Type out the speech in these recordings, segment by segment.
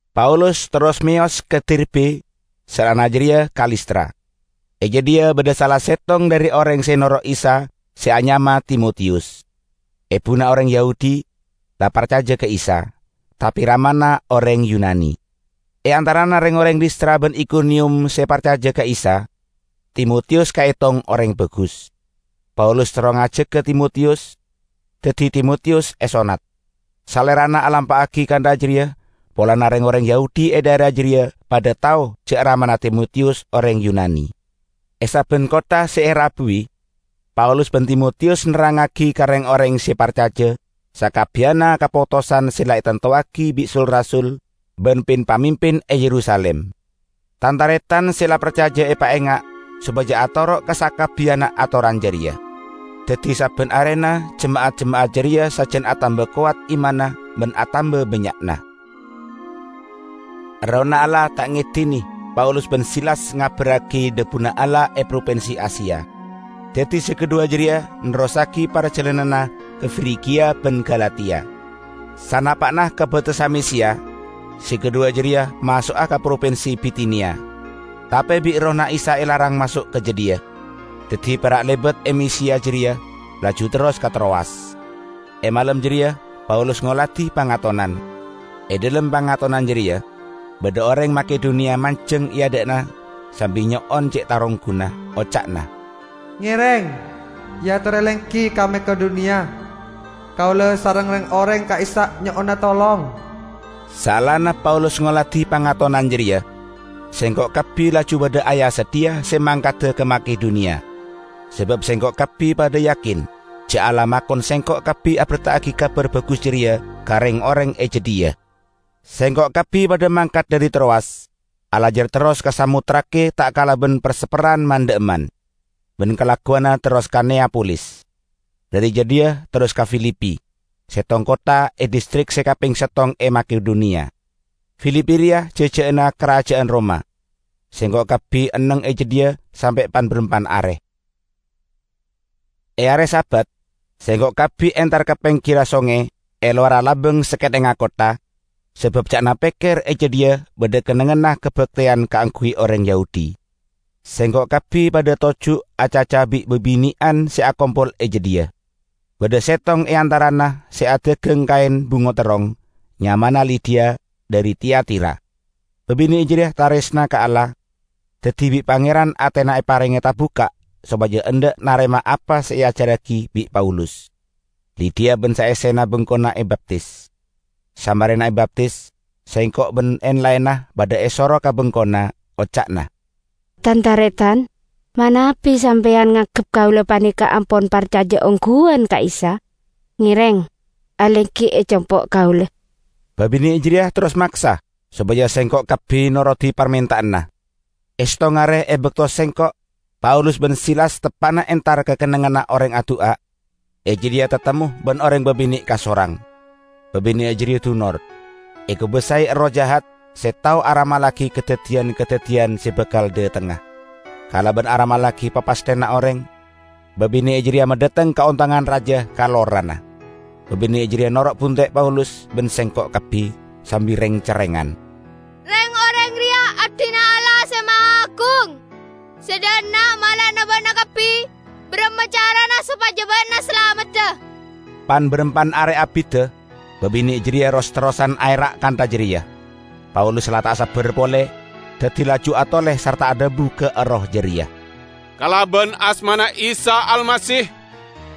Paulus terros meyos ka Derbe, saellana jareya ka Listra. E jadhiya badha sala settong dhari oreng se noro' Isa se anyama Timotiyus. Ebuna oreng Yahudi, la parcaja ka Isa; tape ramana oreng Yunani. E antarana reng-oreng Listra ban Ikoniyum se parcaja ka Isa, Timotiyus kaetong oreng bagus. Paulus terro ngajaga Timotiyus, daddi Timotiyus esonnat. Salerana alampa'agi kantha jareya polana reng-oreng Yahudi e dhaera jareya padha tao ja' ramana Timotiyus oreng Yunani. E sabban kottha se erabuwi, Paulus ban Timotiyus nerrangngagi ka reng-oreng se parcaja sakabbiyanna kapotosan se la etantowagi bi' sul-rasul ban pin-pamimpin e Yerusalim. Tan-taretan se la parcaja epaenga' sopaja atoro' ka sakabbiyanna atoran jareya. Daddi sabban arena jema'at-jema'at jareya sajan atamba kowat imanna ban atamba bannya'na. Errohna Allah ta' ngedine Paulus ban Silas ngabarragi dhabuna Allah e propinsi Asia. Daddi se kadhuwa jareya nerrossagi parjalananna ka Frigia ban Galatia. Sanapa'na ka batessa Misiya, se kadhuwa jareya maso'a ka propinsi Bitiniya, tape bi' Errohna Isa elarang maso' ka jadhiya. Daddi pera' lebat e Misiya jareya, laju terros ka Trowas. E malem jareya Paulus ngoladi pangatonan. E dhalem pangatonan jareya badha oreng Makedoniya manjeng e adha'anna sambi nyo'on ce' tarongguna, oca'na, "Ngereng eatore lenggi ka Makedoniya, kaula sareng reng-oreng e ka'issa' nyo'ona tolong." Saellana Paulus ngoladi pangatonan jareya, sengko' kabbi laju padha aya-sadhiya se mangkada ka Makedoniya. Sabab sengko' kabbi padha yakin ja' Allah makon sengko' kabbi aberta'agi Kabar Bagus jareya ka reng-oreng e jadhiya. Sengko' kabbi padha mangkat dhari Trowas, alajar terros ka Samotrake ta' kalaban per-sepperran man-dha'emman, ban kalagguwanna terros ka Neyapolis. Dhari jadhiya terros ka Filipi, settong kottha e distrik se kapeng settong e Makedoniya. Filipi reya jaja'anna karaja'an Roma. Sengko' kabbi enneng e jadhiya sampe' pan-barampan are. E are Sabat sengko' kabbi entar ka penggirra songay e lowarra labang sakethengnga kottha, sabab ca'na pekker e jadhiya badha kennengnganna kabakteyan kaangguy oreng Yahudi. Sengko' kabbi padha toju' acaca bi' babine'an se akompol e jadhiya. Badha settong e antarana se adagang kaen bungo terrong, nyamana Lidiya, dhari Tiatira. Babine' jareya taresna ka Allah, daddi bi' Pangeran atena eparenge tabukka' sopaja endha' narema apa se eajarragi bi' Paulus. Lidiya ban saessena bengkona ebaptis. Samarena ebaptis sengko' ban en-laenna padha esoro ka bengkona. Oca'na, "Tan-taretan, manabi sampeyan nganggep kaula paneka ampon parcaja ongguwan ka Isa, ngereng alenggi e compo' kaula." Babine' jareya terros maksa sopaja sengko' kabbi norodi parmenta'anna. E settong are e bakto sengko', Paulus ban Silas teppa'na entar ka kennengnganna oreng adu'a, e jadhiya tatemmo ban oreng babine' kasorang; babine' jareya dunor, ekobasae Erroh jahat se tao aramallagi kadaddiyan-kadaddiyan se bakal dhatengnga. Kalaban aramallagi papasthenna oreng, babine' jareya madhateng kaontongan raja ka lorana. Babine' jareya noro' bunte' Paulus ban sengko' kabbi, sambi reng-cerrengan, "Reng-oreng reya abdina Allah Se Mahaagung! Se dha' enna' mala'ana ba'na kabbi baramma carana sopaja ba'na salamedda!" Pan-barampan are abidda babine' jareya ros-terrosan aera' kantha jareya. Paulus la ta' sabbar pole, daddi laju atole sarta adhabu ka erroh jareya, "Kalaban asmana Isa Almasih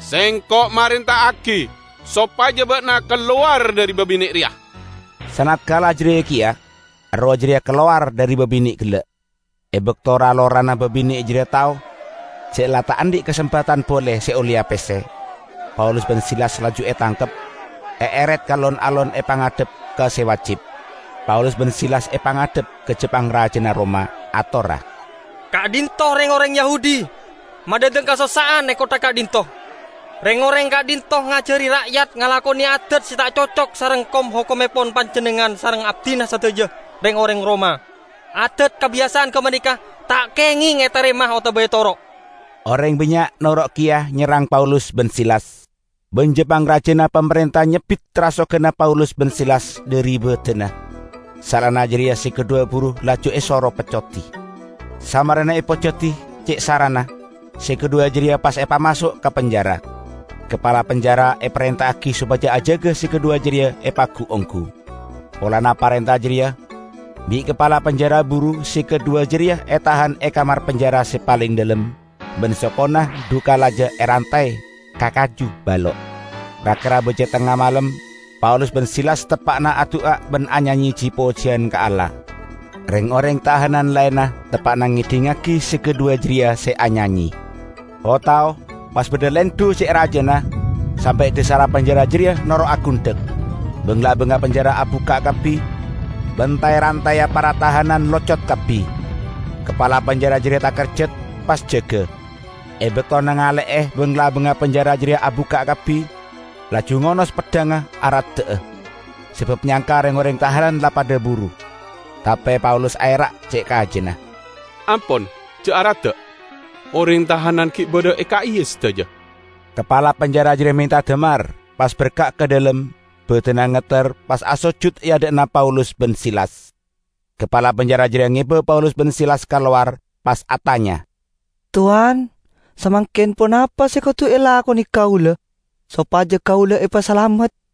sengko' marenta'agi sopaja ba'na kalowar dhari babine' reya!" Sanatkala jareya keya erroh jareya kalowar dhari babine' gella'. E bakto ra-lorana babine' jareya tao ja' la ta' andhi' kasempadan pole se olleya pesse, Paulus ban Silas laju etangkep, eeret ka lon-alon epangadhep ka se wajib. Paulus ban Silas epangadhep ka ja-pangraja Roma, atorra, "Ka'dhinto' reng-oreng Yahudi, madhateng kasossa'an e kottha ka'dhinto'. Reng-oreng ka'dhinto' ngajari ra'yat ngalakone adad se ta' cocok sareng kom-hokommepon panjennengngan sareng abdina sadaja, reng-oreng Roma. Adad kabiyasa'an gapaneka ta' kengeng etarema otaba etoro'!" Oreng bannya' noro' keya nyerrang Paulus ban Silas; ban ja-pangrajana pamarenta nyebbit rasoganna Paulus ban Silas dhari badanna; saellana jareya se kadhuwa buru laju esoro peccodi. Samarena epeccodi ce' sarana, se kadhuwa jareya pas epamaso' ka penjara. Kapala penjara eparenta'agi sopaja ajaga se kadhuwa jareya epagu-onggu. Polana parenta jareya, bi' kapala penjara buru se kadhuwa jareya etahan e kamar penjara se paleng dhalem, ban sokona dhu kalaja erantay ka kaju balo'. Ra-kera baja tengnga malem Paulus ban Silas teppa'na adu'a ban anyanye ji-pojiyan ka Allah. Reng-oreng tahanan laenna teppa'na ngedhingngagi se kadhuwa jareya se anyanye. O-tao pas badha lendhu ce' rajana, sampe' dhasarra penjara jareya noro' agundhek. Bang-labangnga penjara abukka' kabbi ban tay-rantayya para tahanan locot kabbi. Kapala penjara jareya takerjat, pas jaga. E bakto nangale'e bang-labangnga penjara jareya abukka' kabbi laju ngonos peddhangnga aradda'a, sabab nyangka reng-oreng tahanan la padha buru. Tape Paulus aera' ce' kajana, "Ampon ja' aradda'! Oreng tahanan gi' badha e ka'iya sadaja!" Kapala penjara jareya menta damar, pas berka' ka dhalem, badanna ngetter, pas asojut e adha'na Paulus ban Silas. Kapala penjara jareya ngeba Paulus ban Silas ka lowar, pas atanya, "Towan, samangken ponapa se kodu elakone kaula sopaja kaula epasalamet?"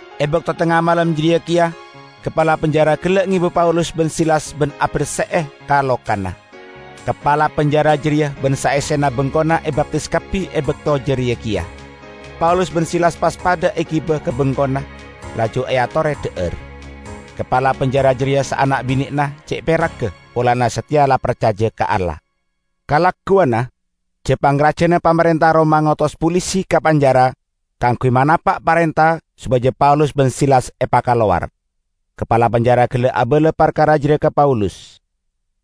E bakto tengnga malem jareya keya kapala penjara gella' ngeba Paulus ban Silas ban aberse'e ka-lokana. Kapala penjara jareya ban saessena bengkona ebaptis kabbi e bakto jareya keya. Paulus ban Silas pas padha egiba ka bengkona, laju eatore dha'ar. Kapala penjara jareya saana' binena ce' peragga polana sateya la parcaja ka Allah. Kalagguwanna, ja-pangrajana pamarenta Roma ngotos polisi ka penjara kaangguy manapa' parenta sopaja Paulus ban Silas epakalowar. Kapala penjara gella' abala parkara jareya ka Paulus.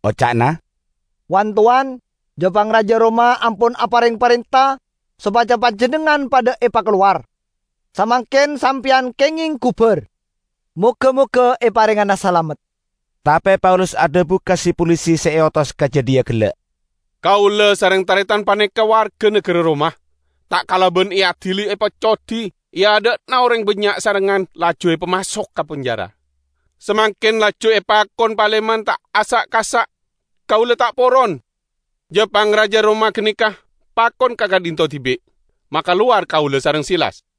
Oca'na, "Wan-towan, ja-pangraja Roma ampon apareng parenta sopaja panjennengngan padha epakalowar. Samangken sampeyan kengeng gubar. Moga-moga eparengngana salamet!" Tape Paulus adhabu ka si-polisi se eotos ka jadhiya gella', "Kaula sareng taretan paneka warga nagara Roma. Ta' kalaban eadili epeccodi e adha'na oreng bannya' sarengngan laju epamaso' ka penjara. Samangken laju epakon paleman ta' asa'-kasa'? Kaula ta' poron! Ja-pangraja Roma ganeka pakon ka ka'dhinto' dibi' makalowar kaula sareng Silas."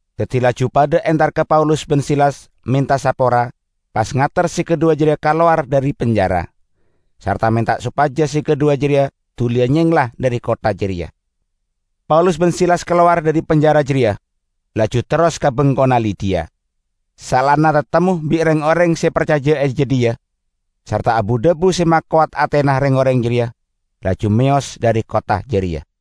Daddi laju padha entar ka Paulus ban Silas, menta sapora, pas ngater se kadhuwa jareya kalowar dhari penjara, sarta menta sopaja se kadhuwa jareya duliya nyengla dhari kottha jareya. Paulus ban Silas kalowar dhari penjara jareya, laju terros ka bengkona Lidiya. Saellana tatemmo bi' reng-oreng se parcaja e jadhiya, sarta abu-dhabu se makowat atena reng-oreng jareya, laju meyos dhari kottha jareya.